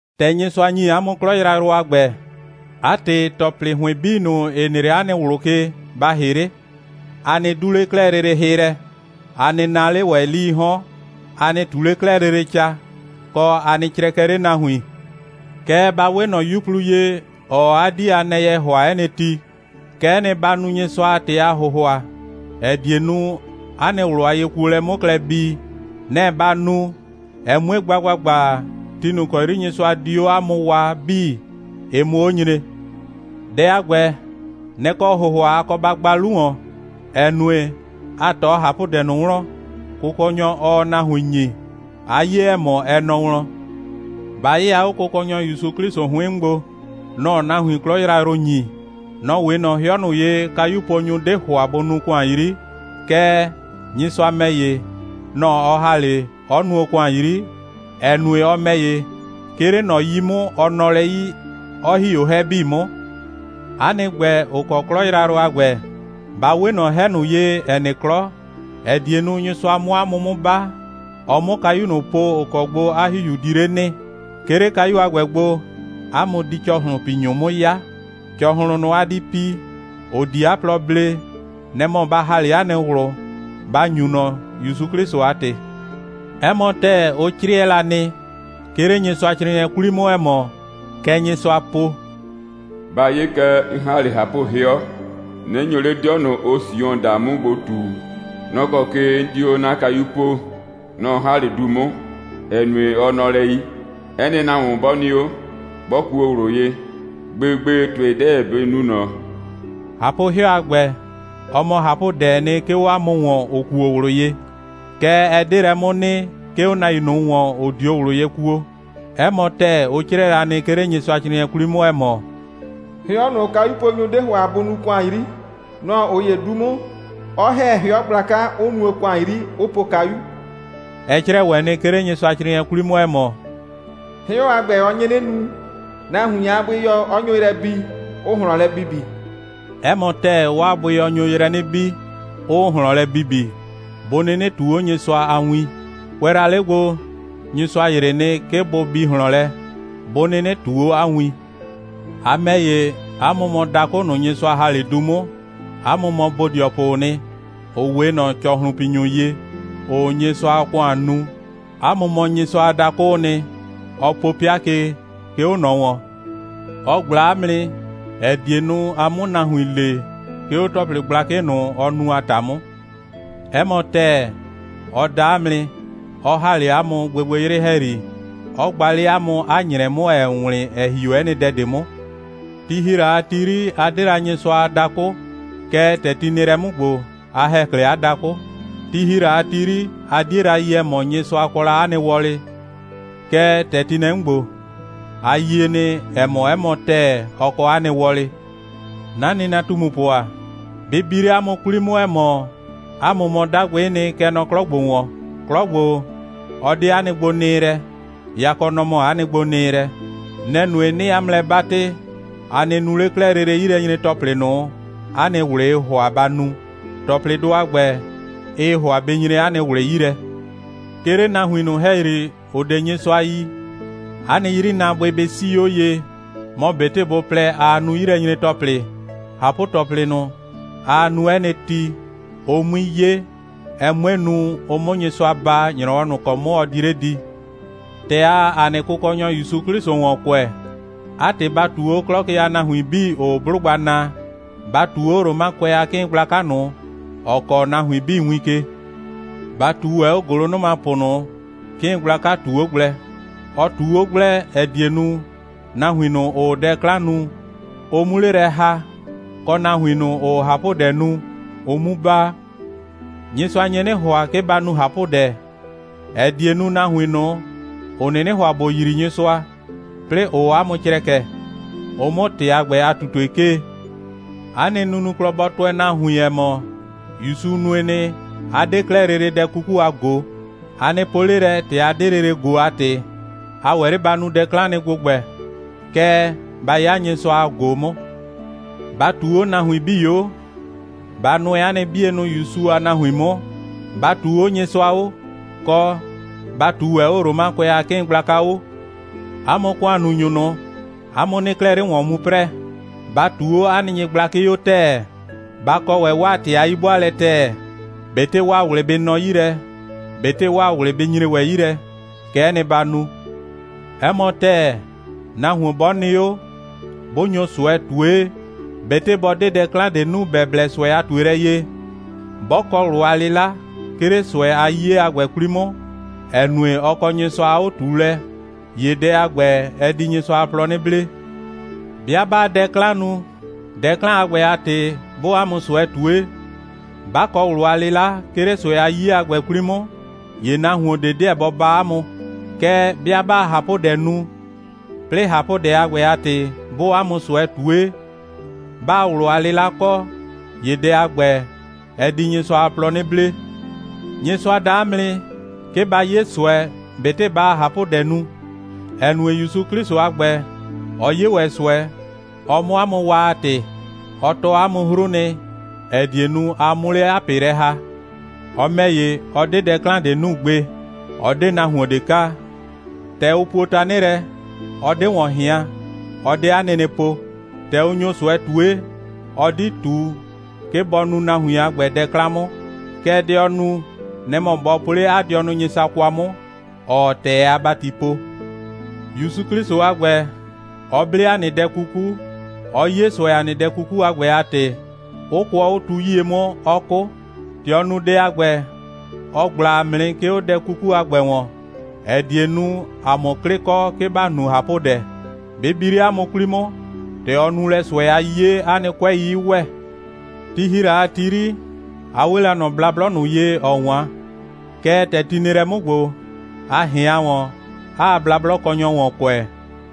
‑Tɛ Nyɩsʋa ‑nyi 'a mʋ 'klɔ yrayrʋ a ‑gbɛ, 'a ‑tɩ, ‑tɔplɩ ‑hʋɩn 'bii ꞊nʋ, ‑ɩ nɩ 'le 'a nɩ ꞊wlʋ ke, ba ‑hɩ 'le, a nɩ 'du 'le 'klɛɛ lele hɩ lɛ, a nɩ naa 'le ‑wɛ 'lii 'hɔn, a nɩ ꞊tu 'le 'klɛɛ lele ca, kɔ, a nɩ crɛkɛ 'le nahuin. Kɛɛ, ba 'we ꞊nɔ 'yuplu ye, ‑ɔɔ 'a 'dii a nɛyɛ ‑hʋa 'ɛ nɩ ti. Kɛ'ɛ nɩ, ba nu Nyɩsʋa a ‑tɩ a ‑hʋhʋa, ‑ɛ die nu, 'a nɩ ꞊wlʋ a yekuolɛ 'mʋ klɛ bii. Nɛ‑ ba nu, ɛ 'mue gba ‑gbagba, ti ꞊nʋ ‑kɔ 'yri Nyɩsʋa di 'o 'a mʋ waa 'bii, ɩ 'mʋ 'o nyre. Dɛ a ‑gbɛ, nɛ‑ kɔ ‑hʋhʋa a kɔ ba gba 'lu ‑wɔn, ‑ɛ nue, a ꞊tɔ ꞊hapʋdɛ ꞊nʋ wlɔn, Kʋkɔnyɔ, ɔɔ nahuin ‑nyi, 'a 'ye, ‑ɛ mɔ, ɛ nɔ wlɔn. Ba 'yɩya 'o Kʋkɔnyɔ ‑Yusu 'Klɩsʋ 'hʋɩn 'mʋ gbo. Nɔ‑ɔ nahuin 'klɔ yrayrʋ ‑nyi. Nɔ‑ 'we ꞊nɔ 'hɩɔ ꞊nʋ ye, kayuponyʋ 'de ‑hʋa bʋ nuu ‑kʋan 'yri. Kɛɛ, Nyɩsʋa ‑mɛ ‑ye, nɔ‑ ɔ ‑ha 'le, 'ɔ nuo ‑kʋan 'yri, ‑ɛ nue, ɔ ‑mɛ ‑ye, 'ke 'le ꞊nɔ 'yi 'mʋ, ɔ nɔ lɛ 'yi, 'ɔ ‑hi 'o 'hɛ 'bii 'mʋ. 'A nɩ ‑gbɛ, ‑ʋ kɔ 'klɔ yrayrʋ a ‑gbɛ, ba 'we ꞊nɔ 'hɛ ꞊nʋ ye, ‑ɛ nɩ 'klɔ, ‑ɛ die nu, Nyɩsʋa 'mʋ 'a mʋ 'mʋ 'ba, ɔ 'mʋ kayu ꞊nʋ po, ‑ʋ kɔ gbo 'a ‑Hihiu di 'le nɩ. 'Ke 'le kayu a ‑gbɛ gbo, 'a mʋ di ‑cɔhlʋnpinyʋ 'mʋ 'ya. ‑Cɔhlʋn ꞊nʋ, a di pi, ‑ʋ di 'a plɔ blee, nɛ‑ mɔ ba ‑ha 'le 'a nɩ ꞊wlʋ, ba ‑nyu ꞊nɔ, ‑Yusu 'Klɩsʋ a ‑tɩ. 'Ɛ mɔ ‑tɛɛ, ʋ 'crɩɛ la nɩ, 'ke 'le Nyɩsʋacrɩɩnɩɛ 'kwli 'mʋ, ‑ɛ mɔ, kɛ Nyɩsʋa po: «Ba 'ye kɛ, 'n ‑ha 'le ꞊hapʋ'hɩɔ, 'nɩ nyo 'le 'dɩɔ ꞊nʋ, ʋʋ Sion (Jrusrɛ) daa 'mʋ gbo ꞊tu. Nɔ‑ kɔ ke 'n di 'o 'na kayu poo. Nɔ‑ 'n ‑ha 'le du 'mʋ, ‑ɛ nue, ɔ nɔ lɛ 'yi. 'Ɛ nɩ nahuon 'bɔ nɩ 'o, 'bɔ kuo ꞊wlʋ ye, gbegbe ‑tʋɩ 'deɛ bɩ nu ꞊nɔ.» ꞊Hapʋ'hɩɔ a ‑gbɛ, ɔ mɔ ꞊hapʋdɛɛ nɩ, 'ke 'o 'a mʋ ‑wɔn, ‑ʋ kuo ꞊wlʋ ye. Kɛɛ, ɛ 'de lɛ 'mʋ nɩ, 'ke 'o nahuin ꞊nʋ ‑wɔn, ‑ʋ 'dio ꞊wlʋ ye kuo. 'Ɛ mɔ ‑tɛɛ, ʋ 'crɩɛ la nɩ, 'ke 'le Nyɩsʋacrɩɩnɩɛ 'kwli 'mʋ, ‑ɛ mɔ: «'Hɩɔ ꞊nʋ, kayuponyʋ 'de ‑hʋa bʋ nuu ‑kʋan 'yri, nɔ‑ ꞊ʋ ‑ye 'du 'mʋ, 'ɔ ‑hɛ 'hɩɔ gblaka, 'ʋ nuo ‑kʋan 'yri, 'ʋ po kayu.» Ɛ 'crɛɛ ‑wɛ nɩ, 'ke 'le Nyɩsʋacrɩɩnɩɛ 'kwli 'mʋ, ‑ɛ mɔ: «'Hɩɔ a ‑gbɛ, ɔ nye 'nɩ nu, nahuin a bʋɩyɔ 'ɔ nyo yrɛ bi, 'ʋʋ ꞊hlɔn lɛ bibi.» 'Ɛ mɔ ‑tɛɛ, 'waa bʋɩyɔ nyo yrɛ 'nɩ bi, 'ʋʋ ꞊hlɔn lɛ bibi, bʋ 'nɩnɩ ꞊tuu 'o Nyɩsʋa a win. Kʋɛ la 'le gbo, Nyɩsʋa ‑yrɩ nɩ, 'ke bʋ bi ꞊hlɔn lɛ, 'bʋ 'nɩnɩ ꞊tuu 'o 'a win. A ‑mɛ ‑ye, 'a mʋ mɔ dakʋ ꞊nʋ, Nyɩsʋa ‑ha 'le du 'mʋ. 'A mʋ mɔ bodɩɔpʋʋ nɩ, ‑ʋ 'we ꞊nɔ ‑cɔhlʋnpinyʋ ye, ‑ʋʋ Nyɩsʋa a ‑kʋan nu. 'A mʋ mɔ Nyɩsʋa a dakʋʋ nɩ, ɔ po 'pɩa ke, 'ke 'o ꞊nɔ ‑wɔn. Ɔ ꞊gbla 'a mʋ nɩ, ‑ɛ die nu, a 'mʋ nahuin le, 'ke 'o ‑tɔplɩ gblakɩ ꞊nʋ, ɔ nu a ‑ta 'mʋ. 'Ɛ mɔ ‑tɛɛ, ɔ da 'a mʋ nɩ, 'ɔ ‑ha 'le 'a mʋ gbɩgbɩyrɩ ‑hɛyri, 'ɔ gba 'le 'a mʋ 'a ‑nyrɛ 'mʋ, ‑ɛɛ wlɩn, ‑ɛ ‑hi 'o 'ɛ nɩ dɛ ꞊de 'mʋ. Ti ‑hi la a ti 'yri, a 'de la Nyɩsʋa a dakʋ, kɛɛ, ‑tɛ ti nɩ lɛ 'mʋ ‑gbo, a ‑hɛ 'klɛɛ 'a dakʋ. Ti ‑hi la a ti 'yri, a 'die la yi, ‑ɛ mɔ, Nyɩsʋa kɔ la 'a nɩ wɔlɩ, kɛɛ, ‑tɛ ti nɛ 'mʋ ‑gbo, a yie nɩ, ‑ɛ mɔ, 'ɛ mɔ ‑tɛɛ, ɔ kɔ 'a nɩ wɔlɩ. 'Na nɩnatumupʋ ‑a, bɩ bi 'le 'a mʋ 'kwli 'mʋ, ‑ɛ mɔ, 'a mʋ mɔ 'dagbɩ'ɩ nɩ, kɛ nɔ 'klɔ ‑gbo ‑wɔn. 'Klɔ ‑gbo, ɔ 'de 'a nɩ gbonɩɩlɛ, yakɔ, nɔ‑ mɔ 'a nɩ gbonɩɩlɛ. Nɛ‑ nue, 'nɩɩ 'a mʋ lɛ 'batɩ, a nɩ nu 'le 'klɛɛ lele 'yilɛnyre‑tɔplɩ ꞊nʋ, 'a nɩ ꞊wlɩɩ ‑hʋa ba nu. ‑Tɔplɩdʋ a ‑gbɛ, ɩɩ ‑hʋa bɩ nyre 'a nɩ ꞊wlɩ 'yi lɛ. 'Ke 'le nahuin ꞊nʋ ‑hɛyri, ‑ʋ 'de Nyɩsʋa yi, 'a nɩ 'yrinaabʋɩ bɩ 'sii 'o ye, mɔ ꞊betɩ bʋ plɛ, aa nu 'yilɛnyre‑tɔplɩ, ꞊hapʋ‑tɔplɩ ꞊nʋ, aa nu 'ɛ nɩ ti, ʋ 'mui 'ye, ɛ 'mue nu, ʋ 'mʋ Nyɩsʋa baa, ‑nyrɔwɔ ꞊nʋ ‑kɔ 'mʋ ɔ di 'le di. ‑Tɛ aa ‑a nɩ Kʋkɔnyɔ ‑Yusu 'Klɩsʋ ‑wɔn kʋɛ, 'a ‑tɩ, ba ꞊tuu 'o 'klɔ ke a nahuin 'bii, ‑ʋʋ 'blʋgba naa. Ba ꞊tuu 'o Romakʋɛ a 'kɩɩn gblaka ꞊nʋ, ‑ɔ kɔɔ nahuin 'bii win ke. Ba ꞊tuu ‑wɛ 'o ‑gʋlʋnʋmapʋ ꞊nʋ, 'kɩɩn gblaka ꞊tu 'o gblɛ. Ɔ ꞊tu 'o gblɛ, ‑ɛ die nu, nahuin ꞊nʋ, ‑ʋʋ dɛ 'klan nu, ʋ 'mu 'le lɛ ‑ha, kɔ, nahuin ꞊nʋ, ‑ʋʋ ꞊hapʋdɛ nu, ʋ 'mu baa. Nyɩsʋa nye 'nɩ ‑hʋa, 'ke ba nu ꞊hapʋdɛ, ‑ɛ die nu, nahuin ꞊nʋ, ‑ʋ 'nɩnɩ ‑hʋa ‑bʋ yrii Nyɩsʋa, 'plɩɩ, ‑ʋʋ 'a mʋ crɛkɛ, ʋ 'mʋ ‑tɩ a ‑gbɛ a ꞊tutue 'kee. 'A nɩ nunuklɔ bɔ tʋɛ nahuin, ‑ɛ mɔ, ‑Yusu nue nɩ, 'a 'de 'klɛɛ lele dɛ 'kuku a ꞊go. A nɩ po 'le lɛ, ‑tɛ a 'de lele ꞊go a ‑tɩ, a ‑wɛ 'le ba nu dɛ 'klan nɩ ‑gbʋgbɛ. Kɛɛ, ba 'ya Nyɩsʋa a ꞊go 'mʋ. Ba ꞊tuu 'o nahuin 'bii 'o, ba nʋɛ 'a nɩ 'bienʋ ‑Yusu a nahuin 'mʋ, ba ꞊tuu 'o Nyɩsʋa 'o, kɔ, ba ꞊tuu ‑wɛ 'o Romakʋɛ a 'kɩɩn gblaka 'o. 'A mʋ ‑kʋannunyʋ ꞊nʋ, 'a mʋ 'nɩɩ 'klɛɛ 'le ‑wɔn mu 'prɛɛ. Ba ꞊tuu 'o 'a nɩ nyɩgblakɩ 'o ‑tɛɛ. Ba kɔ ‑wɛ 'waa ‑tɩ a 'yi'bʋaalɛ ‑tɛɛ. ꞊Betɩ 'waa ꞊wlɩ bɩ nɔ 'yi lɛ, ꞊betɩ 'waa ꞊wlɩ bɩ nyre ‑wɛ 'yi lɛ, kɛ'ɛ nɩ, ba nu. 'Ɛ mɔ ‑tɛɛ, nahuon 'bɔ nɩ 'o, 'bʋ nyo ꞊sʋɛ ꞊tue, ꞊betɩ bɔ 'de dɛ 'klan ꞊de nu, ‑bɛ blɛ ꞊sʋɛ a ꞊tuelɛ ye, 'bɔ kɔ ꞊wlʋ a 'lɩla, 'ke 'le ꞊sʋɛ a 'yiye a ‑gbɛ 'kwli 'mʋ, ‑ɛ nue, ɔ kɔ Nyɩsʋa a 'o꞊tuulɛ, ‑ye dɛ a ‑gbɛ, ɛ di Nyɩsʋa a plɔ 'nɩ blee. 'Bɩa 'baa dɛ 'klan nu, dɛ 'klan a ‑gbɛ a ‑tɩ 'bʋʋ 'a mʋ ꞊sʋɛ ꞊tue, 'ba kɔ ꞊wlʋ a 'lɩla, 'ke 'le ꞊sʋɛ a 'yiye a ‑gbɛ 'kwli 'mʋ, ‑ye nahuon ꞊de 'deɛ bɔ baa 'a mʋ. Kɛɛ, 'bɩa 'baa ꞊hapʋdɛ nu, 'plɩɩ ꞊hapʋdɛ a ‑gbɛ a ‑tɩ 'bʋʋ 'a mʋ ꞊sʋɛ ꞊tue, 'baa ꞊wlʋ a 'lɩla kɔ, ‑ye dɛ a ‑gbɛ, ɛ di Nyɩsʋa a plɔ 'nɩ blee. Nyɩsʋa da 'a mʋ nɩ, 'ke ba 'ye ꞊sʋɛ, ꞊betɩ baa ꞊hapʋdɛ nu, ‑ɛ nue, ‑Yusu 'Klɩsʋ, 'a ‑gbɛ, ɔ 'ye ‑wɛ ꞊sʋɛ, ɔ 'mʋ 'a mʋ waa a ‑tɩ. Ɔ tɔɔ 'a mʋ 'hru nɩ, ‑ɛ die nu, a 'mʋ 'le 'a ꞊pɩ lɛ ‑ha. Ɔ ‑mɛ ‑ye, ɔ 'de dɛ 'klan ꞊de nu gbe. Ɔ 'de nahuon ꞊de kaa. ‑Tɛ ʋ puo tanɩ lɛ, ɔ 'de ‑wɔn ꞊hɩan, ɔ 'de 'a nɩnɩ po. ‑Tɛ ʋ nyo ꞊sʋɛ ꞊tue, ɔ 'di ꞊tu, 'ke bɔ nu nahuin a ‑gbɛ dɛ 'klan 'mʋ. Kɛɛ, dɛ ɔ nu, nɛ‑ mɔ bɔ po 'le 'a dɩɔnʋ Nyɩsʋa kwa 'mʋ, ‑ɔɔ ‑tɛɛ a ‑bati po. ‑Yusu 'Klɩsʋ a ‑gbɛ, ɔ 'ble ‑a nɩ dɛ 'kuku, 'ɔ 'ye ꞊sʋɛ ‑a nɩ dɛ 'kuku a ‑gbɛ a ‑tɩ, 'ʋ kʋɔ 'o tu 'yie 'mʋ, 'ɔ 'kʋ. ‑Tɛ ɔ nu dɛ a ‑gbɛ, ɔ ꞊gbla ‑a mʋ nɩ, 'ke 'o dɛ 'kuku a ‑gbɛ ‑wɔn, ‑ɛ die nu, ‑a 'mʋ 'klɩ kɔ, 'ke ‑ba nu ꞊hapʋdɛ. Bɩ bi 'le 'a mʋ 'kwli 'mʋ, ‑tɛ ɔ nu lɛ ꞊sʋɛ a 'yiye, 'a nɩ 'kʋɛi 'ɩ ‑wɛ. Ti ‑hi la a ti 'yri, a 'we la ꞊nɔ blablɔ ꞊nʋ ye, ‑ɔ 'wan. Kɛɛ, ‑tɛ ti nɩ lɛ 'mʋ ‑gbo, a ꞊hɩan ‑wɔn, 'aa blablɔkɔnyɔ ‑wɔn kʋɛ,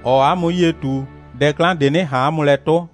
‑ɔɔ 'a mʋ 'yie ꞊tu, dɛ 'klan ꞊de 'nɩ ꞊han 'a mʋ lɛ 'tʋ.